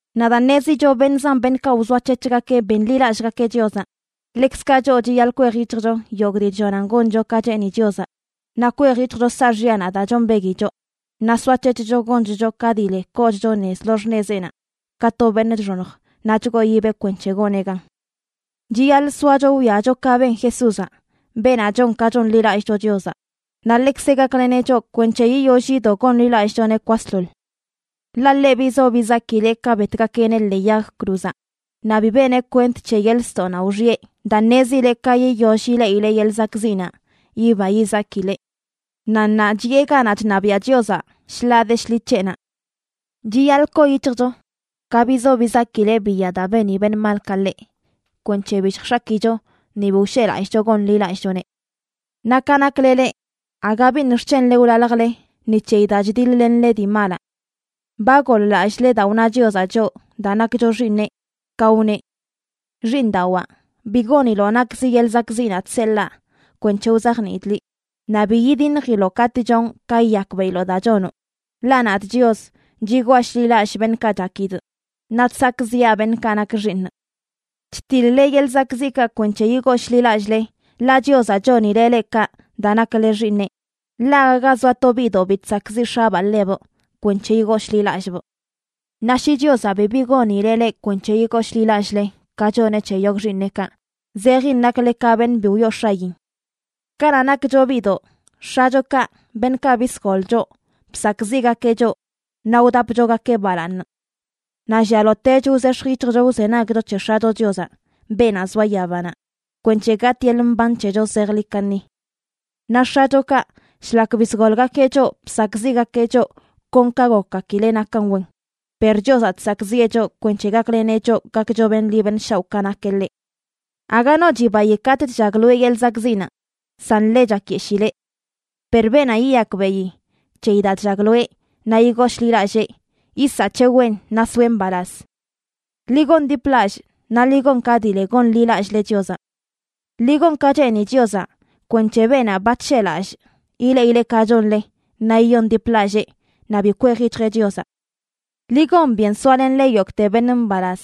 Naꞌ daa ṉezicho beṉꞌ zan beṉꞌkaꞌ wzoac̱hec̱hgakeꞌ benḻilallꞌgakeꞌ Chiozaꞌ, ḻekzkaꞌ choꞌ chiyaḻꞌ kwej yic̱hjcho yogꞌ dii chllonan goncho ka cheeni Chiozaꞌ naꞌ kwej yic̱hjcho saaxyanaꞌ daa chombegui choꞌ, naꞌ soac̱hec̱hcho gonchcho ka dii le koochcho nez lo xṉezeꞌnaꞌ ka to beṉꞌ chxoṉj naꞌ chgooyibeꞌ kwenc̱he goneꞌ gan. Chiyaḻꞌ soacho wwiacho ka ben Jesúzaꞌ, beenaꞌ chon ka chonḻilallꞌcho Chiozaꞌ, naꞌ ḻekzeꞌ gakleneꞌ choꞌ kwenc̱he yiyoll yido gonḻilallꞌchoneꞌ kwasḻoḻ. Ḻaꞌ ḻeꞌ bizo bizakileꞌ ka betgakeꞌneꞌ ḻee yag cruzaꞌ, naꞌ bi beneꞌ kwent c̱he yeḻꞌ ztoꞌnaꞌ wxiꞌe daa ṉezileꞌ ka yiyoll ileꞌileꞌ yeḻꞌ zakꞌziꞌnaꞌ, yiba yizakileꞌ. Naꞌ ṉaa chiꞌe ganaꞌ chṉabiaꞌ Chiozaꞌ shḻaa de shḻi c̱heꞌnaꞌ. Chiyaḻꞌ koo yic̱hjcho ka bizo bizakileꞌ biya daa beni beṉꞌ malkaꞌ ḻeꞌ kwenc̱he bi lljx̱akicho ni bi wsheꞌlallꞌcho gonḻilallꞌchoneꞌ. Naꞌ ka nakle leꞌ, aga biṉꞌ xc̱henle wlaljle ni c̱heyi daa chdiḻ-lenle dii malaꞌ. Ba goḻ-lallꞌle daa wna Chiozaꞌ choꞌ daa nakcho xiiṉeꞌ, ka wneꞌ: Xiiṉdawaa, bi goniloꞌ nakzi yeḻꞌ zakꞌziꞌnaꞌ chseḻaa kwenc̱he wzajniidꞌ liꞌ, naꞌ bi yidiṉjiloꞌ katꞌ chonꞌ ka yiyakbeꞌiloꞌ daa chonoꞌ. Ḻaꞌ nadꞌ Chios, chigwaa shḻi lallꞌ beṉꞌkaꞌ chakidꞌ, naꞌ chsakꞌziꞌa beṉꞌkaꞌ nak xiiṉꞌ. Chtiḻ-le yeḻꞌ zakꞌziꞌkaꞌ kwenc̱he yigooshḻilallꞌle, ḻaꞌ Chiozaꞌ chonileꞌ leꞌ kaꞌ daa nakle xiiṉeꞌ. Ḻaꞌ aga ga zoa to biꞌdoꞌ bi chsakꞌziꞌ x̱abaa ḻebꞌ kwenc̱he yigooshḻilallꞌbꞌ. Naꞌ shi Chiozaꞌ bibi gonileꞌ leꞌ kwenc̱he yigooshḻilallꞌle, ka choneꞌ c̱he yogꞌ xiiṉeꞌkaꞌ, zejin nakle ka beṉꞌ bi wyoo x̱ayin. Kanaꞌ nakcho biꞌdoꞌ, x̱achokaꞌ, beṉꞌkaꞌ bisgol choꞌ, bsakꞌziꞌgakeꞌ choꞌ naꞌ wdapchogakeꞌ balaaṉ. Naꞌ llialotech wzex̱j yic̱hjcho wzenagcho c̱he X̱acho Chiozaꞌ, beenaꞌ zoa yabanaꞌ, kwenc̱he gatꞌ yeḻꞌ mban c̱hecho zejḻi kaṉi. Naꞌ x̱achokaꞌ, shlak bisgolgakeꞌ choꞌ bsakꞌziꞌgakeꞌ choꞌ kon ka gokgakileꞌ nakan wen. Per Chiozaꞌ chsakꞌziꞌe choꞌ kwenc̱he gakleneꞌ choꞌ gakcho beṉꞌ ḻi beṉꞌ shaoꞌ ka nakeꞌ ḻeꞌ. Aga no chibayi katꞌ chllagloeꞌ yeḻꞌ zakꞌziꞌnaꞌ, san ḻe chakyeshileꞌ. Per beenaꞌ yiyakbeꞌi c̱heyi daa chllagloeꞌ naꞌ yigooshḻilallee, yisaꞌ c̱he wen naꞌ soeꞌ mbalaz. Ḻi gondiplallꞌ, naꞌ ḻi gon ka dii le gonḻilallꞌle Chiozaꞌ. Ḻi gon ka cheeni Chiozaꞌ kwenc̱he beenaꞌ ba chsheꞌlallꞌ ileꞌileꞌ ka chonle naꞌ yiyondiplallee naꞌ bi kwej yic̱hjeꞌ Chiozaꞌ. Ḻi gon byen soalenle yogꞌte beṉꞌ mbalaz,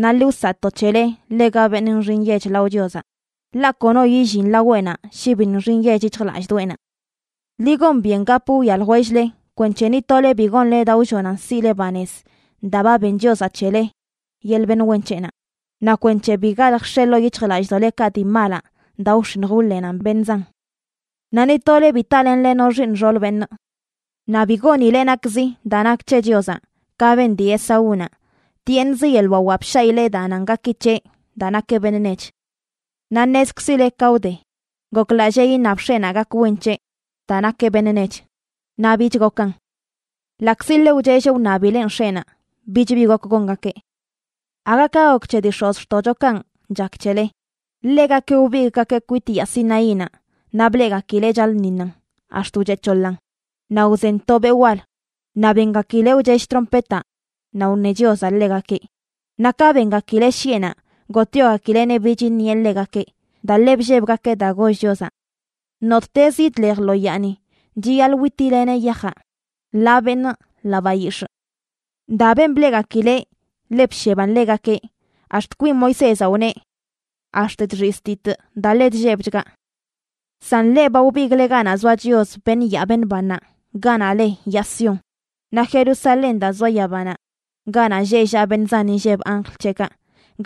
naꞌ ḻi wsaꞌto c̱hele ḻega beṉꞌ nxi nyech lao Chiozaꞌ, ḻaꞌ kono yillin laweꞌnaꞌ shi bi nxi nyech yic̱hjlallꞌdoꞌenaꞌ. Ḻi gon byen gap wwia ljwell-le kwenc̱he ni tole bi gonle daa wllonan siꞌle banez daa ba ben Chiozaꞌ c̱hele yeḻꞌ beṉꞌ wen c̱heꞌnaꞌ, naꞌ kwenc̱he bi galj x̱e ḻoo yic̱hjlallꞌdoꞌlekaꞌ dii malaꞌ daa wx̱iṉj wḻenan beṉꞌ zan. Naꞌ ni tole bi talenle no xiiṉ xool beṉꞌ. Naꞌ bi gonile nakzi daa nak c̱he Chiozaꞌ, ka ben dii Esaúnaꞌ. Tyeeṉz yeḻꞌ wawaꞌ bshaꞌileꞌ daa nan gaki c̱heꞌ daa nakeꞌ beṉꞌ nech. Naꞌ ṉezkzile ka wde, goklallee iṉab x̱eꞌnaꞌ gak wen c̱heꞌ daa nakeꞌ beṉꞌ nech, naꞌ bich gokan. Ḻaꞌkzi ḻe wchelleꞌ wṉabileꞌn x̱eꞌnaꞌ, bich bi gok gongakeꞌ. Aga ka gok c̱he dii x̱ozxtoꞌchokanꞌ chak c̱hele. Ḻegakeꞌ wbigꞌgakeꞌ kwit yaa Sinaínaꞌ naꞌ bleꞌgakileꞌ chaḻꞌṉiṉan, ax̱t wcheꞌ c̱hoḻaꞌn, naꞌ wzen to beꞌ wal, naꞌ bengakileꞌ wchell trompetaꞌ naꞌ wṉe Chiozaꞌ ḻegakeꞌ. Naꞌ ka bengakileꞌ shiꞌenaꞌ gotꞌyogakileꞌneꞌ bich iṉieꞌ ḻegakeꞌ, daa ḻe bllebgakeꞌ daa goll Chiozaꞌ: “Nottez yidlej lo yaani chiyaḻꞌ wítileneꞌ yajaꞌ, ḻaa beṉꞌ ḻaa bayix̱ꞌ.” Daa ben bleꞌgakileꞌ ḻe bsheban ḻegakeꞌ, ax̱t kwin Moisézaꞌ wneꞌ: “Ax̱t chxiztitꞌ daa ḻe chllebchgaꞌ.” San leꞌ ba wbigꞌle ganaꞌ zoa Chios, beṉꞌ yaa beṉꞌ bannaꞌ, ganaꞌ le yaa Sión naꞌ Jerusalén daa zoa yabanaꞌ, ganaꞌ lleꞌ llaꞌ beṉꞌ zan inlleb anjl c̱heꞌkaꞌ,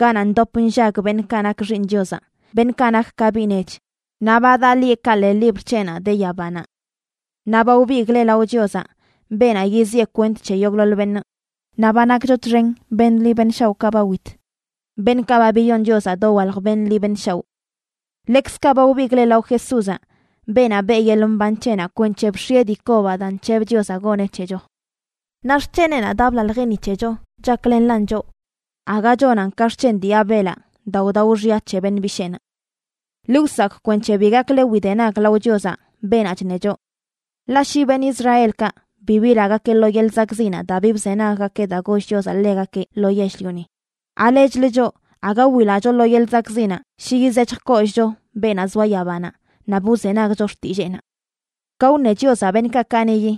ganaꞌ ndop nllag beṉꞌkaꞌ nak xiiṉꞌ Chiozaꞌ, beṉꞌkaꞌ nak ka biꞌ nech, naꞌ ba daꞌ lieꞌkaꞌ ḻee libr c̱heꞌnaꞌ de yabanaꞌ. Naꞌ ba wbigꞌle lao Chiozaꞌ, beenaꞌ yiziꞌe kwent c̱he yogꞌḻoḻ beṉꞌ. Naꞌ ba nakcho txen beṉꞌ ḻi beṉꞌ shaoꞌkaꞌ ba wit, beṉꞌkaꞌ ba biyon Chiozaꞌ dowalj beṉꞌ ḻi beṉꞌ shaoꞌ. Ḻekzkaꞌ ba wbigꞌle lao Jesúzaꞌ, beenaꞌ beꞌ yeḻꞌ mban c̱heꞌnaꞌ kwenc̱he bx̱ieꞌ dii kobaꞌ daa nc̱heb Chiozaꞌ goneꞌ c̱hecho. Naꞌ xc̱heneꞌnaꞌ daa blaljeꞌ ni c̱hecho chaklenlan choꞌ, aga chonan ka xc̱hen dii Abelaꞌ daa wdao xya c̱he dii beṉꞌ bisheenaꞌ. Ḻi wsakꞌ kwenc̱he bi gakle widenag lao Chiozaꞌ, beenaꞌ chṉe choꞌ. Ḻaꞌ shi beṉꞌ Israelkaꞌ bi bilagakeꞌ lo yeḻꞌ zakꞌziꞌnaꞌ daa bi bzenaggakeꞌ daa goll Chiozaꞌ ḻegakeꞌ lo yell-lioni, ¿alechlə choꞌ, aga wilacho lo yeḻꞌ zakꞌziꞌnaꞌ shi yizec̱hj kollꞌcho beenaꞌ zoa yabanaꞌ naꞌ bi wzenagcho xtilleenaꞌ? Ka wṉe Chiozaꞌ beṉꞌkaꞌ kaniꞌyi,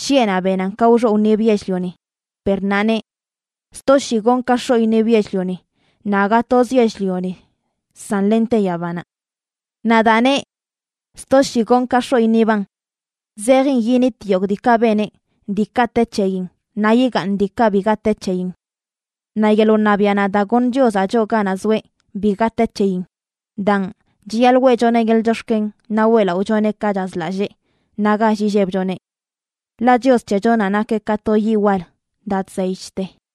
shiꞌenaꞌ benan ka wxoꞌ wṉib yell-lioni, per ṉaa neꞌ: “Sto shii gonꞌ ka x̱oꞌ iṉib yell-lioni, naꞌ aga toz yell-lioni, san lente yabanaꞌ.” Naꞌ daa neꞌ “sto shii gonꞌ ka x̱oꞌ iṉiban”, zejin yinit yogꞌ diikaꞌ beneꞌ, diikaꞌ te c̱heyin, naꞌ yigaaṉ diikaꞌ biga te c̱heyin. Naꞌ yeḻꞌ wṉabiaꞌ daa goṉ Chiozaꞌ choꞌ ganaꞌ zoeꞌ, biga te c̱heyin. Daan, chiyaḻꞌ weꞌchoneꞌ yeḻꞌ chox̱ken naꞌ weꞌlaꞌochoneꞌ ka chazlallee naꞌ gall illebchoneꞌ. Ḻaꞌ Chios c̱hechonaꞌ nakeꞌ ka to yiꞌ wal daa chzey chte.